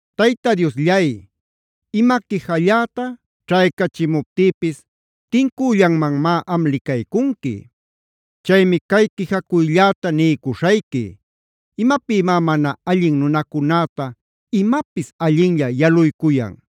Tayta Diosllay, ima quijalläta ćhaycachimuptïpis tincüllanmanmá am licaycunqui. Chaymi cay quijacuylläta niycuśhayqui, ¿imapïmá mana allin nunacunäta imapis allinlla yaluycuyan?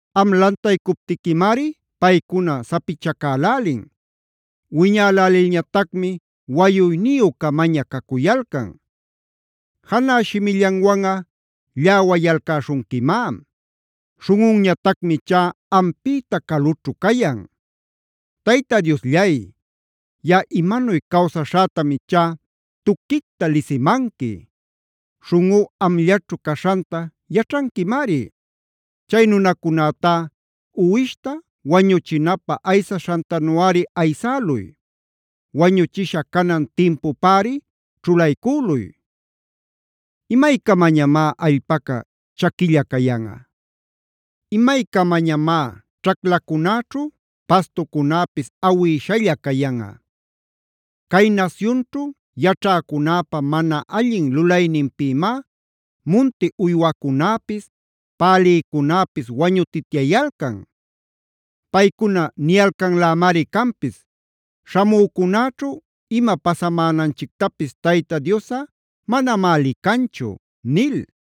Am lantaycuptiquimari paycuna sapichacälälin; wiñälälilñatacmi wayuyniyü-camaña cacuyalcan. Janä shimillanwanꞌa lläwayalcäśhunquimá; śhunꞌunñatacmi ichá ampïta calućhu cayan. Tayta Diosllay, yaꞌa imanuy cawsaśhätam ichá tuquicta lisimanqui. Śhunꞌú amllaćhu caśhanta yaćhanquimari. Chay nunacunätá uwishta wañuchinapä aysaśhantanuꞌari aysäluy. Wañuchisha canan timpupäri ćhulaycüluy. ¿Imaycamañamá allpaca chaquilla cayanꞌa? ¿Imaycamañamá ćhaclacunäćhu pastucunäpis awïshalla cayanꞌa? Cay nasyunćhu yaćhäcunäpa mana allin lulayninpïmá munti uywacunäpis, pälïcunäpis wañutityayalcan. Paycuna niyalcanlämari canpis: “Śhamücunäćhu ima pasamänanchictapis Tayta Diosꞌa manamá licanchu” nil.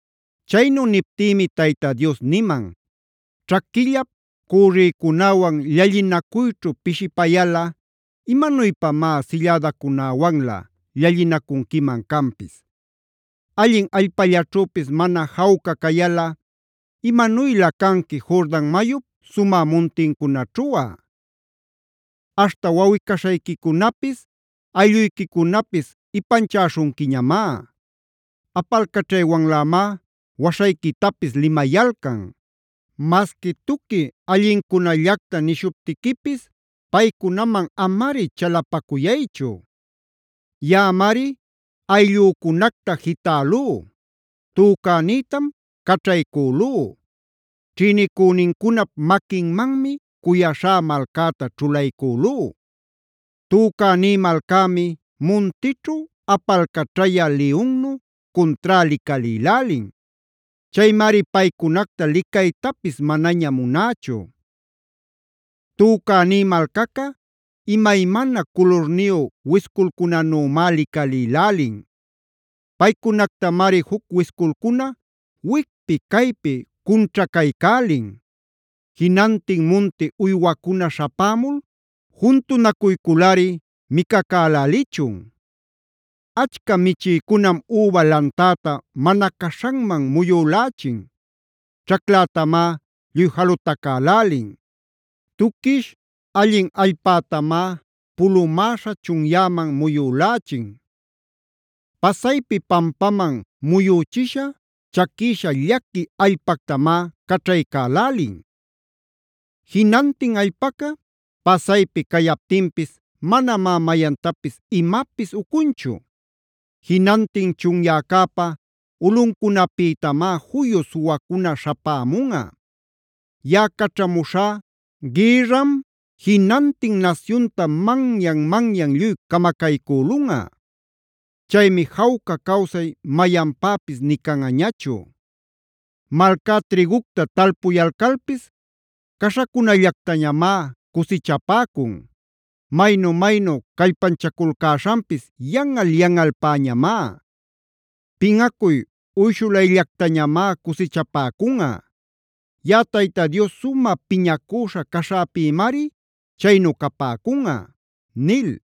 Chaynu niptïmi Tayta Dios niman: “Ćhaquillap cürrïcunäwan llallinacuyćhu pishipayalꞌa, ¿imanuypamá sillädacunäwanlä llallinacunquiman canpis? Allin allpallaćhüpis mana jawca cayalꞌa, ¿imanuylä canqui Jordan mayup sumä muntincunaćhuꞌa? Aśhta wawꞌi-caśhayquicunapis, aylluyquicunapis ipanchäśhunquiñamá. Apalcaćhaywanlämá waśhayquitapis limayalcan. Masqui tuqui allincunallacta nishuptiquipis paycunaman amari chalapacuyaychu. “Yaꞌamari ayllücunacta jitälú; tücänïtam caćhaycülú. Ćhïnicünincunap maquinmanmi cuyaśhá malcäta ćhulaycülú. Tücäní malcämi muntićhu apalcaćhayä liyunnu cuntrá licalïlälin. Chaymari paycunacta licaytapis manaña munächu. Tücäní malcaca imaymana culurniyu wisculcunanümá licalïlälin. Paycunactamari juc wisculcuna wicpi caypi cunćhacaycälin. Jinantin munti uywacuna śhapämul juntunacuyculꞌari micacälälichun. “Achca michïcunam üba lantäta mana caśhanman muyülächin; ćhaclätamá lluy jalutacälälin. Tuquish allin allpätamá pulumäśha chunyäman muyülächin. Pasaypi pampaman muyüchisha, chaquïsha llaqui allpactamá caćhaycälälin. Jinantin allpaca pasaypi cayaptinpis manamá mayantapis imapis ucunchu. Jinantin chunyäcäpa ulꞌuncunapïtamá juyu suwacuna śhapämunꞌa. Yaꞌa caćhamuśhá gïrram, jinantin nasyunta manyan-manyan lluy camacaycülunꞌa. Chaymi jawca cawsay mayanpäpis nï canꞌañachu. Malcá trïgucta talpuyalcalpis caśhacunallactañamá cusichapäcun. Maynu-maynu callpanchaculcäśhanpis yanꞌal-yanꞌalpäñamá. Pinꞌacuy uyshulayllactañamá cusichapäcunꞌa. YaꞌaTayta Dios sumä piñacüśha caśhäpïmari chaynu capäcunꞌa” nil.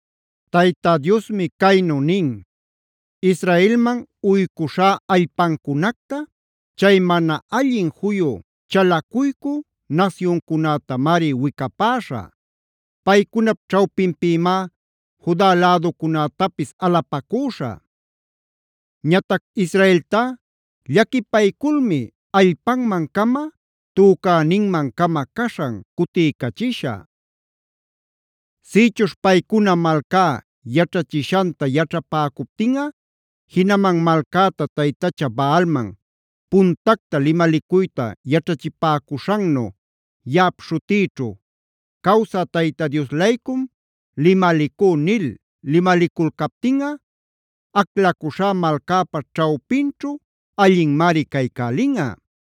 Tayta Diosmi caynu nin: “Israelman uycuśhá allpancunacta chay mana allin juyu chalacuycü nasyuncunätamari wicapäśhä. Paycunap ćhawpinpïmá Juda läducunätapis alapacüśhä. Ñatac Israeltá llaquipayculmi allpanman-cama, tücäninman-cama caśhan cutiycachishä. Sïchuśh paycuna malcá yaćhachishanta yaćhapäcuptinꞌa jinaman malcäta taytacha Baalman puntacta limalicuyta yaćhachipäcuśhannu yaꞌap śhutïćhu: ‘Cawsä Tayta Dios-laycum limalicú’ nil limaliculcaptinꞌa aclacuśhá malcäpa ćhawpinćhu allinmari caycälinꞌa.